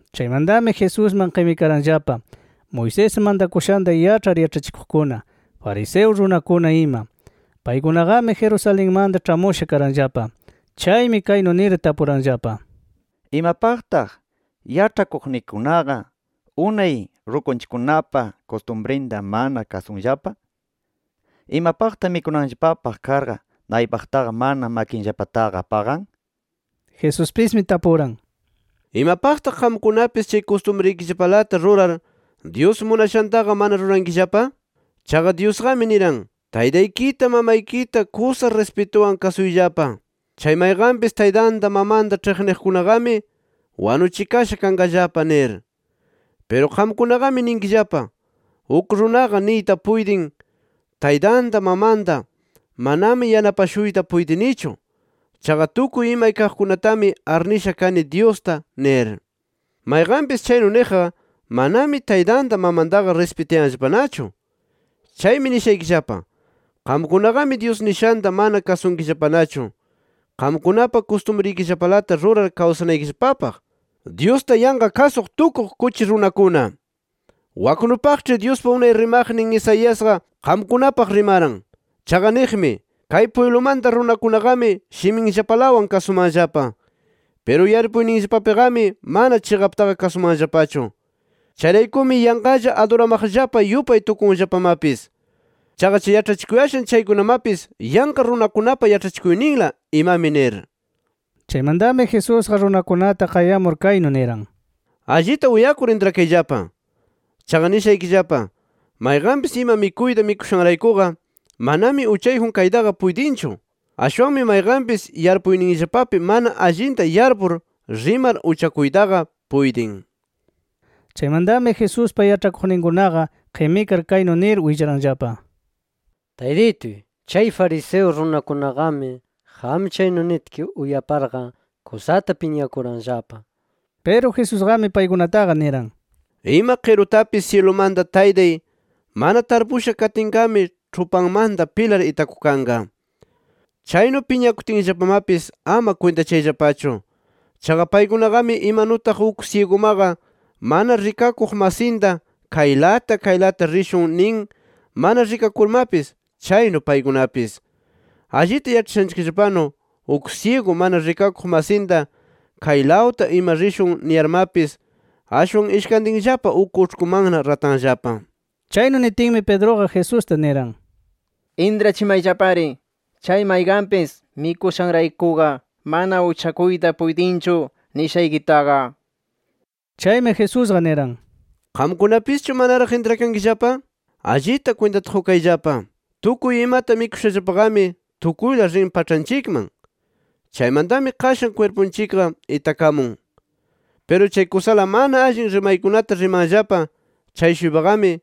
Chaymantami Jesusman qimikaranllapa Moisés mantakushanta yaĉhar yaĉhachikuqkuna, fariseo runakuna ima. Paykunaqami Jerusalenmanta ĉhamusha karanllapa. Chaymi kaynu nir tapuranllapa: —¿Imapaqtaq yaĉhakuqnikikunaqa unay rukunchikkunapa kustumrinta mana kasunllapa? ¿Imapaqtaq mikunanllapapaq karqa, naypaqtaqa mana makinllapataqa paqan? nir. Jesuspismi tapuran: —¿Imapaqtaq qamkunapis chay kustumrikillapalata rurar Dyus munashantaqa mana rurankillapa? Chaqa Dyusqami niran: ‘Taytaykita mamaykita kusa rispituwan kasuyllapa. Chay mayqanpis taytanta mamanta ĉhiqniqkunaqami wanuchikasha kanqallapa’ nir. Piru qamkunaqami ninkillapa, uk runaqa niyta puytin taytanta mamanta: ‘Manami yanapashuyta puytinichu. Chaqa tukuy imay kaqkunatami arnisha kani Dyusta’ nir. Mayqanpis chaynu niqqa, manami taytanta mamantaqa rispitayanllapanachu. Chaymi nishaykillapa: Qamkunaqami Dyus nishanta mana kasunkillapanachu, qamkunapa kustumrikillapalata rurar kawsanaykillapapaq. ¡Dyusta yanqa kasuq tukuq kuchi runakuna! Waknupaqĉhi Dyuspa unay rimaqnin Isaiasqa, qamkunapaq rimaran. Chaqa niqmi: ‘Kay pwiblumanta runakunaqami shiminllapalawan kasumanllapa. Piru yarpuyninllapapiqami mana chiqaptaqa kasumanllapachu. Chayraykumi yanqalla aduramaqllapa yupay tukunllapamapis. Chaqa chay yaĉhachikuyashan chaykunapis yanqa runakunapa yaĉhachikuyninla imami’ nir. Chaymantami Jesusqa runakunata qayamur kaynu niran: —Allita uyakur intrakayllapa. Chaqa nishaykillapa: Mayqanpis ima mikuyta mikushanraykuqa manami uchayjun kaytaqa puytinchu. Ashwanmi mayqanpis yarpuyninllapapi mana allinta yarpur rimar uchakuytaqa puytin. Chaymantami Jesuspa yaĉhakuqninkunaqa qimikar kaynu nir willaranllapa: —¡Taytituy! Chay fariseo runakunaqami qam chaynu nitki uyaparqa kusata piñakuranllapa nir. Piru Jesusqami paykunataqa niran: —Ima qirutapis, syilumanta Taytay, mana tarpusha katinqami, ĉhupanmanta pilar itakukanqa. Chaynu piñakutinllapamapis ama kwintachayllapachu. Chaqa paykunaqami imanutaq uk syigumaqa, mana rikakuq masinta kaylata kaylata rishun nin mana rikakurmapis, chaynu paykunapis. Allita yaĉhashanchikllapanu, uk syigu mana rikakuq masinta kaylawta ima rishun niyarmapis, ashwan ishkantinllapa uk uĉhkumanna ratanllapa. Chaynu nitinmi, Pedruqa Jesusta niran: —Intrachimayllapari chay mayqanpis mikushanraykuqa mana uchakuyta puytinchu nishaykitaqa nir. Chaymi Jesusqa niran: —¿Qamkunamapischu manaraq intrakankillapa? Allita kwintata qukayllapa. Tukuy imata mikushallapaqami tukuyla rin paĉhanchikman. Chaymantami qashan kwirpunchikqa itakamun. Piru chay kusala mana allin rimaykunata rimanllapa chay-shuypaqami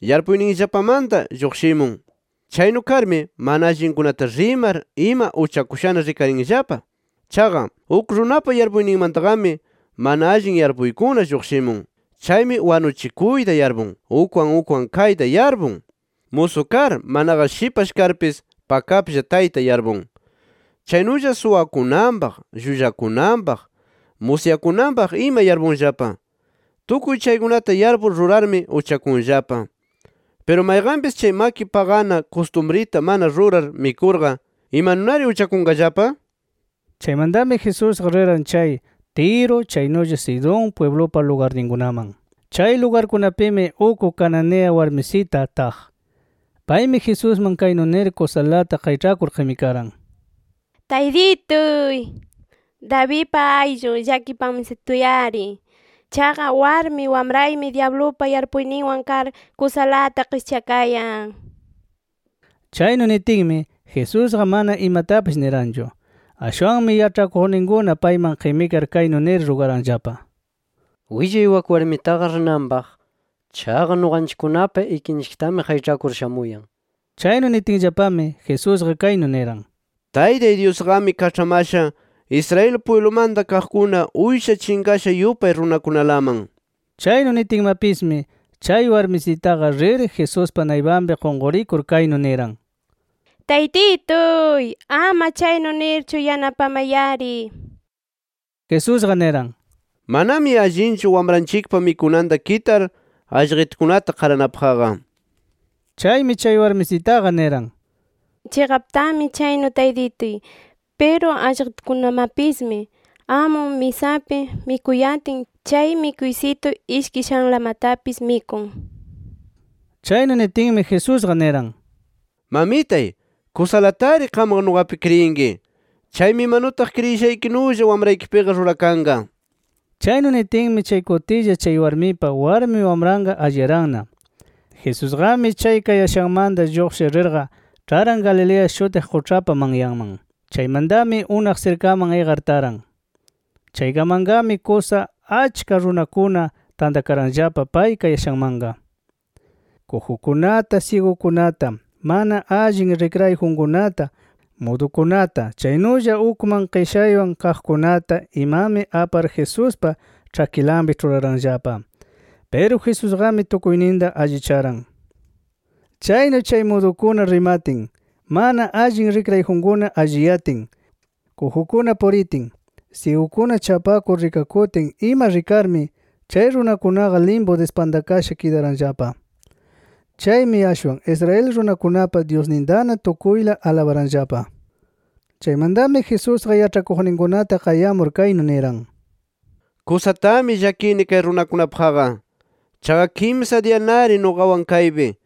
yarpuyninllapamanta lluqshimun. Chaynu karmi mana allinkunata rimar ima uchakushana rikarinllapa. Chaqa, uk runapa yarpuyninmantaqami mana allin yarpuykuna lluqshimun. Chaymi wanuchikuyta yarpun. Ukwan ukwan kayta yarpun. Musu kar, manaqa shipash karpis pakaplla tayta yarpun. Chaynulla suwakunanpaq, llullakunanpaq, musyakunanpaq ima yarpunllapa. Tukuy chaykunata yarpur rurarmi uchakunllapa. Piru mayqanpis chay maki paqana kustumrita mana rurar mikurqa ¿imanunari uchakunqallapa? Chaymantami Jesusqa riran chay Tiro chaynulla Sidón pwiblupa lugarninkunaman. Chay lugarkunapimi uk cananea warmisita taq. Paymi Jesusman kaynu nir kusalata qayĉhakur qimikaran: —¡Taytituy, Davidpa ayllun, llakipamastuy-ari! ¡Chaqa warmi wamraymi dyablupa yarpuyninwan kar kusalata qischakayan! nir. Chaynu nitinmi, Jesusqa mana imatapis niranchu. Ashwanmi yaĉhakuqninkuna payman qimikar kaynu nir rugaranllapa: —Willay wak warmitaqa rinanpaq. Chaqa nuqanchikkunapa ikinchiktami qayĉhakur shamuyan nir. Chaynu nitinllapami, Jesusqa kaynu niran: —Taytay Dyusqami kaĉhamasha Israel pwiblumanta kaqkuna uysha chinqasha yupay runakunalaman. Chaynu nitinmapismi chay warmisitaqa rir Jesuspa naypanpi qunqurikur kaynu niran: —¡Taytituy, ama chaynu nirchu yanapamay-ari! nir. Jesusqa niran: —Manami allinchu wamranchikpa mikunanta kitar allqitukunata qaranapaqqa. Chaymi chay warmisitaqa niran: —Chiqaptami chaynu Taytituy. Piru allqitukunamapismi, amun misapi mikuyatin, chay mikuysitu ishkishanlamatapis mikun nir. Chaynu nitinmi Jesusqa niran: —¡Mamitay, kusalatari qamqa nuqapi kriyinki! Chaymi imanutaq kriyishaykinulla wamraykipiqa rurakanqa nir. Chaynu nitinmi chay kutilla, chay warmipa warmi wamranqa alliyaranna. Jesusqami chay kayashanmanta lluqshir rirqa, ĉharan Galilea shutiq quĉhapa manyanman. Chaymantami unaq sirkaman iqar taran. Chaykamanqami kusa achka runakuna tantakaranllapa pay kayashanmanqa. Kujukunata, syigukunata, mana allin rikrayjunkunata, mudukunata chaynulla ukman qishaywan kaqkunata imami apar Jesuspa ĉhakinlapi ĉhuraranllapa. Piru Jesusqami tukuyninta allicharan. Chaynu chay mudukuna rimatin, mana allin rikrayjunkuna alliyatin, kujukuna puritin, syigukuna chapakur rikakutin ima rikarmi chay runakunaqa limpu dispantakasha kidaranllapa. Chaymi ashwan Israel runakunapa Dyusnintana tukuyla alabaranllapa. Chaymantami, Jesusqa yaĉhakuqninkunata qayamur kaynu niran: —Kusatami llakini kay runakunapaqqa. Chaqa kimsa diyanari nuqawan kaypi.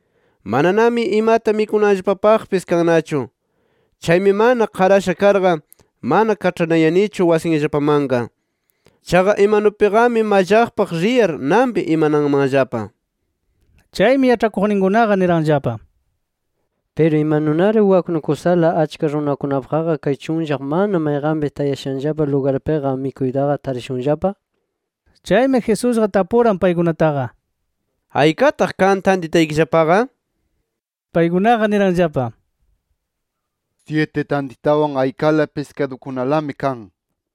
Mananami imata mikunanllapapaqpis kannachu. Chaymi mana qarasha karqa, mana kaĉhanayanichu wasinllapamanqa. Chaqa imanupiqami mallaqpaq riyar nanpi imananmanllapa nir. Chaymi, yaĉhakuqninkunaqa niranllapa: —Piru, ¿imanunari waknu kusala achka runakunapaqqa kay chunllaq mana mayqanpis tayashanllapa lugarpiqa mikuytaqa tarishunllapa? nir. Chaymi Jesusqa tapuran paykunataqa: —¿Aykataq kan tantitaykillapaqa? nir. Paykunaqa niranllapa: —Syiti tantitawan aykala piskadukunalami kan nir.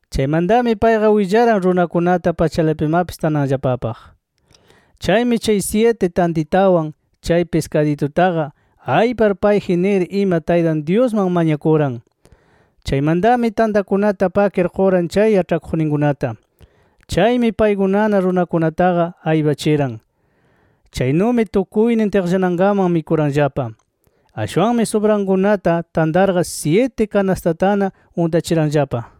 Chaymantami payqa willaran runakunata, pachalapimapis tananllapapaq. Chaymi, chay syiti tantitawan, chay piskadutaqa, aypar payji nir ima Taytan Dyusman mañakuran. Chaymantami, tantakunata pakir quran chay yaĉhakuqninkunata. Chaymi paykunana runakunataqa aypachiran. Chaynumi tukuynin tiqllanankaman mikuranllapa. Ashwanmi subrankunata tantarqa, syiti kanastatana untachiranllapa.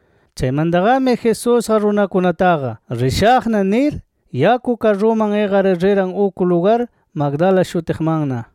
Chaymantaqami Jesusqa runakunataqa, “Rishaqna” nir, yaku karruman iqar riran uk lugar Magdala shutiqmanna.